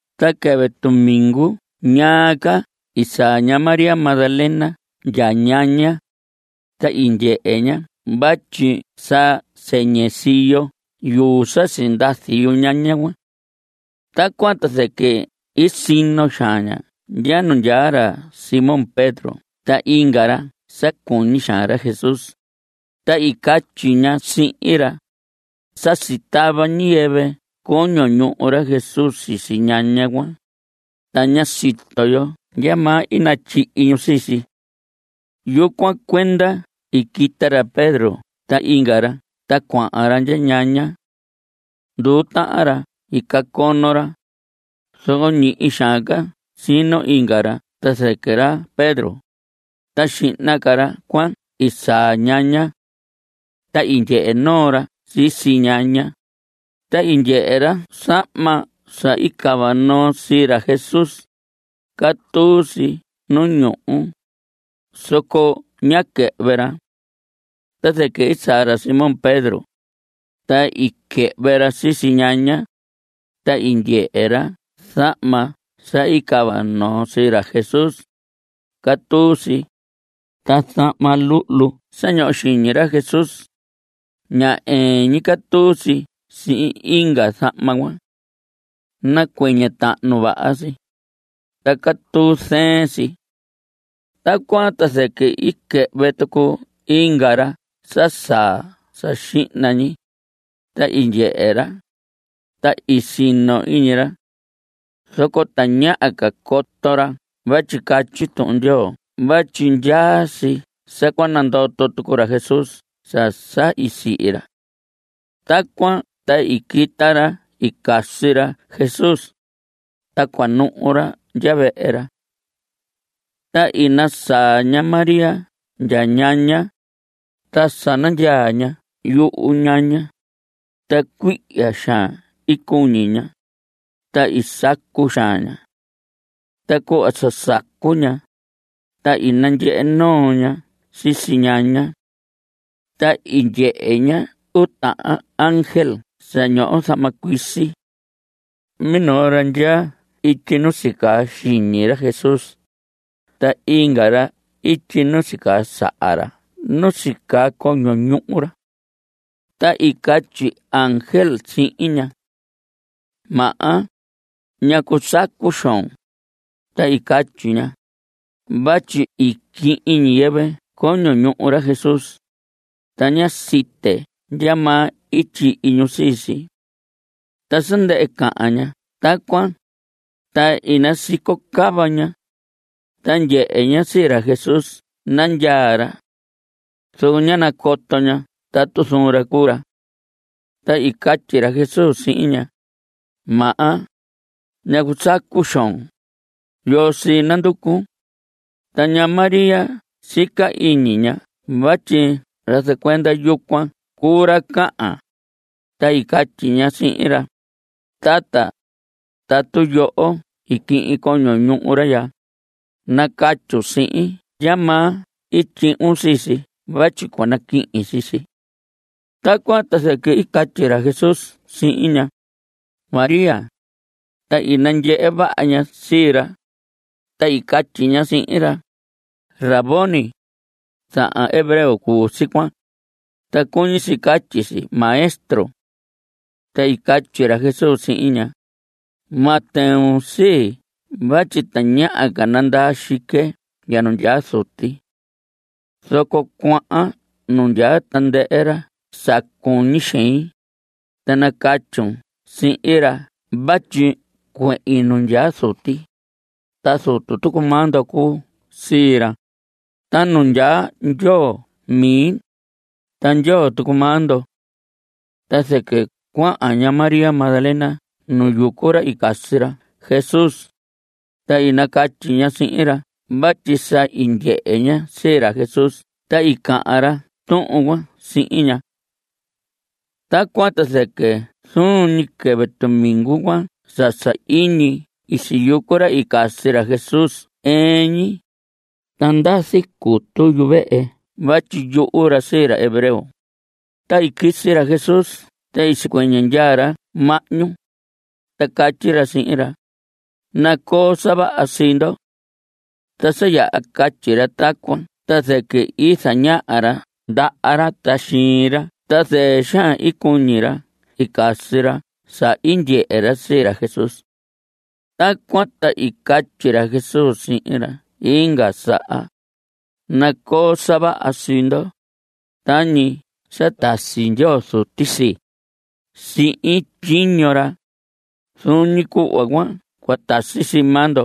Ta quɨvɨ tumingu ñaa ca i saa ña María Magdalena ndya ñaña, ta i ndyehe ña vatyi sa sɨñɨ siyo yuu sa sindazi yuñaña cuan. Tacuan ta zɨquɨ i sino xaan ña ndya nu ndyaa ra Simón Pedro ta inga ra sa cuñi xaan ra Jesús, ta i catyi ña sihin ra: Sa sitava ñiyɨvɨ coño ñuhu ra Jesús sisi ñaña cuan, ta ña sito yo ndyamaa i natyihi ñu sii si. Yucuan cuenda i quita ra Pedro ta inga ra ta cuahan ra ndya ñaña. Nduu tahan ra i cacono ra, zoco ñihi xaan ca sino inga ra ta zɨquɨ ra Pedro, ta xihna ca ra cuan i saa ñaña. Ta i ndyehe noo ra sisi ñaña, ta i ndyehe ra zahma sa i cava noo sii ra Jesús; catuu si nu ñuhu, zoco ñá quɨhvɨ ra. Ta zɨquɨ i saa ra Simón Pedro, ta i quɨhvɨ ra sisi ñaña, ta i ndyehe ra zahma sa i cava noo sii ra Jesús; catuu si. Ta zahma luhlu sa ñoho xiñi ra Jesús, ña ɨɨn ñi catuu si sihin inga zahma cuan. Nacuɨñɨ tahnu vaha si, ta catuu zɨɨn si. Tacuan ta zɨquɨ i quɨhvɨ tucu inga ra sa saa sa xihna ñi. Ta i ndyehe ra. Ta i sino iñi ra. Zoco tañaha ca coto ra vatyi catyi Tuhun Ndyoo vatyi ndyaa si sa cua nandoto tucu ra Jesús sa sa i sihi ra. Tacuan ta i quita ra i casi ra Jesús, ta cua nuhu ra ndya vehe ra. Ta i nasaa ña María ndya ñaña, ta sa nandyaa ña yuhu ñaña, ta cuihya xaan i cuñi ña, ta i sacu xaan ña. Ta cuhva sa sacu ña, ta i nandyehe noo ña sisi ñaña. Ta i ndyehe ña uu tahan ángel sa ñoho zahma cuisi. Minoo ra ndyaa ityi nu sicaa xiñi ra Jesús, ta inga ra ityi nu i sicaa saha ra nu sicaa coño ñuhu ra. Ta i catyi ángel sihin ña: Maha, ¿ñacu sacu xoon? Ta i catyi ña: Vatyi i quihin ñiyɨvɨ coño ñuhu ra Jesús, ta ña site ndyamaa i tyihi ñu sii si. Ta sa ndɨhɨ cahan ña tacuan, ta i nasico cava ña, ta ndyehe ña sii ra Jesús nandyaa ra. Zoco ñá nacoto ña tatu zuun ra cuu ra. Ta i catyi ra Jesús sihin ña: Maha, ¿ñacu sacu xoon? ¿Yoo sii nanducun? Ta ña María sica iñi ña vatyi ra zacuenda yucuan cuu ra cahan, ta i catyi ña sihin ra: Tata, tatu yoho i quihin coño ñuhu ra ya, nacatyun sihin ndyamaa i tyuhun sii si vatyi cua naquihin sii si. Tacuan ta zɨquɨ i catyi ra Jesús sihin ña: María. Ta i nandyehe vaha ña sii ra, ta i catyi ña sihin ra: ¡Rabboni! Zahan hebreo cuu si cuan, ta cuñi si catyi si Maestro. Ta i catyi ra Jesús sihin ña: Ma tɨun sii vatyi tañaha ca nandaa xique ndya nu ndyaa Zuti. Zoco cuahan nu ndyaa tandɨhɨ ra sa cuñi xein, ta nacatyun sihin ra vatyi cuehin nu ndyaa Zuti, ta Zutu tucu maa ndo cuu sii ra. Ta nu ndyaa Ndyoo mi, ta Ndyoo tucu maa ndo. Ta zɨquɨ cuahan ña María Magdalena nu yucu ra i casi ra Jesús, ta i nacatyi ña sihin ra vatyi sa i ndyehe ña sii ra Jesús ta i cahan ra tuhun cuan sihin ña. Tacuan ta zɨquɨ zuun ñi quɨvɨ tumingu cuan sa sahiñi i siyucu ra i casi ra Jesús ɨɨn ñi, ta ndazi cutu yuvehe vatyi yuhu ra sii ra hebreo, ta i quisi ra Jesús ta i sicuɨñɨ ndyaa ra mahñu, ta catyi ra sihin ra: Nacoo sa vaha sii ndo. Ta sa yaha catyi ra tacuan, ta zɨquɨ i zañaha ra ndaha ra ta xiin ra. Ta zɨɨ xaan i cuñi ra i casi ra sa i ndyehe ra sii ra Jesús. Tacuan ta i catyi ra Jesús sihin ra inga saha: Nacoo sa vaha sii ndo. Tañi sa tasi Ndyoo Zuti sii, sihin tyiño ra, zuun ñi cuhva cuan cua tasi sii maa ndo.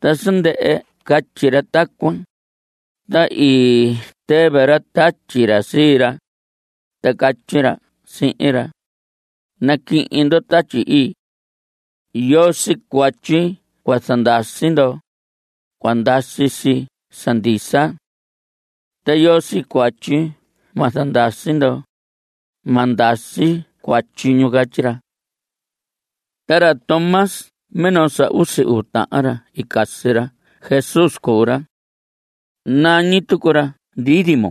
Ta sa ndɨhɨ catyi ra tacuan, ta i tɨvɨ ra tatyi ra sii ra, ta catyi ra sihin ra: Naquihin ndo Tatyi Ii. Yoo sii cuatyi cua zandasi ndo, cua ndasi si sa ndisa. Ta yoo sii cuatyi ma zandasi ndo, ma ndasi cuatyi ñu. Catyi ra. Ta ra Tomás minoo sa usi uu tahan ra i casi ra Jesús cuu ra. Nañi tucu ra Dídimo.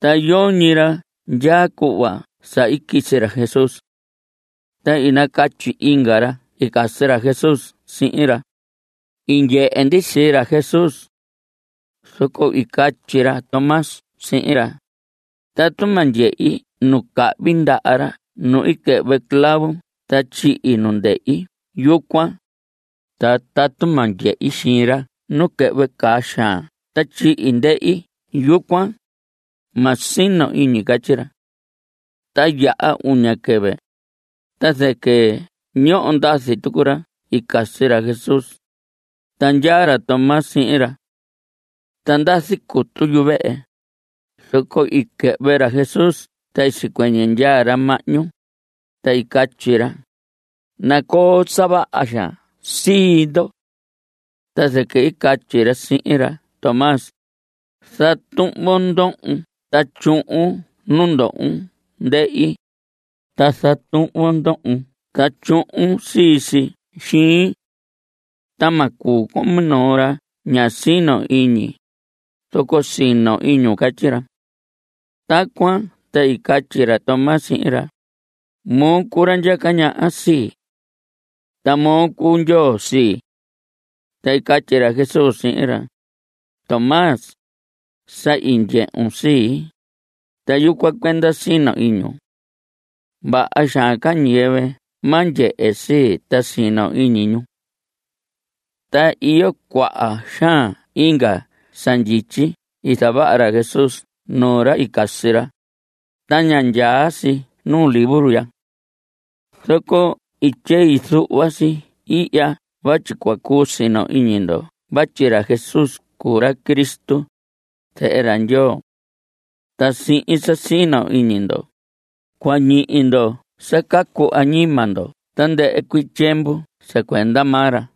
Ta yoñi ra ndyaa cuhva sa quisi ra Jesús. Ta i nacatyi inga ra i casi ra Jesús sihin ra: I ndyehe ndi sii ra Jesús. Zoco i catyi ra Tomás sihin ra: Tatu ma ndyehi nu cahvi ndaha ra nu i quɨhvɨ clavo ta tyihi nu ndehi yucuan, ta tatu ma ndyehi xiin ra nu quɨhvɨ caa xaan ta tyihi ndehi yucuan, ma sino iñi. Catyi ra. Ta yaha uña quɨvɨ, ta zɨquɨ ñoho ndazi tucu ra i casi ra Jesús, ta ndyaa ra Tomás sihin ra. Ta ndazi cutu yuvehe, zoco i quɨhvɨ ra Jesús ta i sicuɨñɨ ndyaa ra mahñu, ta i catyi ra: Nacoo sa vaha xaan sii ndo. Ta zɨquɨ i catyi ra sihin ra Tomás: Zatuhvon ndohon ta tyuhun nu ndohon ndehi, ta zatuhvon ndohon ta tyuhun sisi xiin. Ta ma cuu con minoo ra ña sino iñi, zoco sino iñun. Catyi ra. Tacuan ta i catyi ra Tomás sihin ra: Moo cuu ra ndyaca ñaha sii. Ta moo cuu Ndyoo sii. Ta i catyi ra Jesús sihin ra: Tomás, sa i ndyehun sii, ta yucuan cuenda sino iñun. Vaha xaan ca ñiyɨvɨ ma ndyehe sii, ta sino iñi ñu. Ta iyo cuaha xaan inga sa ndyityi i zavaha ra Jesús nuu ra i casi ra, ta ña ndyaa si nuu libro ya. Zoco i tyei zuhva si ihya vatyi cua cuu sino iñi ndo vatyi ra Jesús cuu ra Cristo, zehe ra Ndyoo. Ta sihin sa sino iñi ndo, cua ñihi ndo sa cacu añima ndo tandɨhɨ cuii tyiemvu sa cuenda maa ra.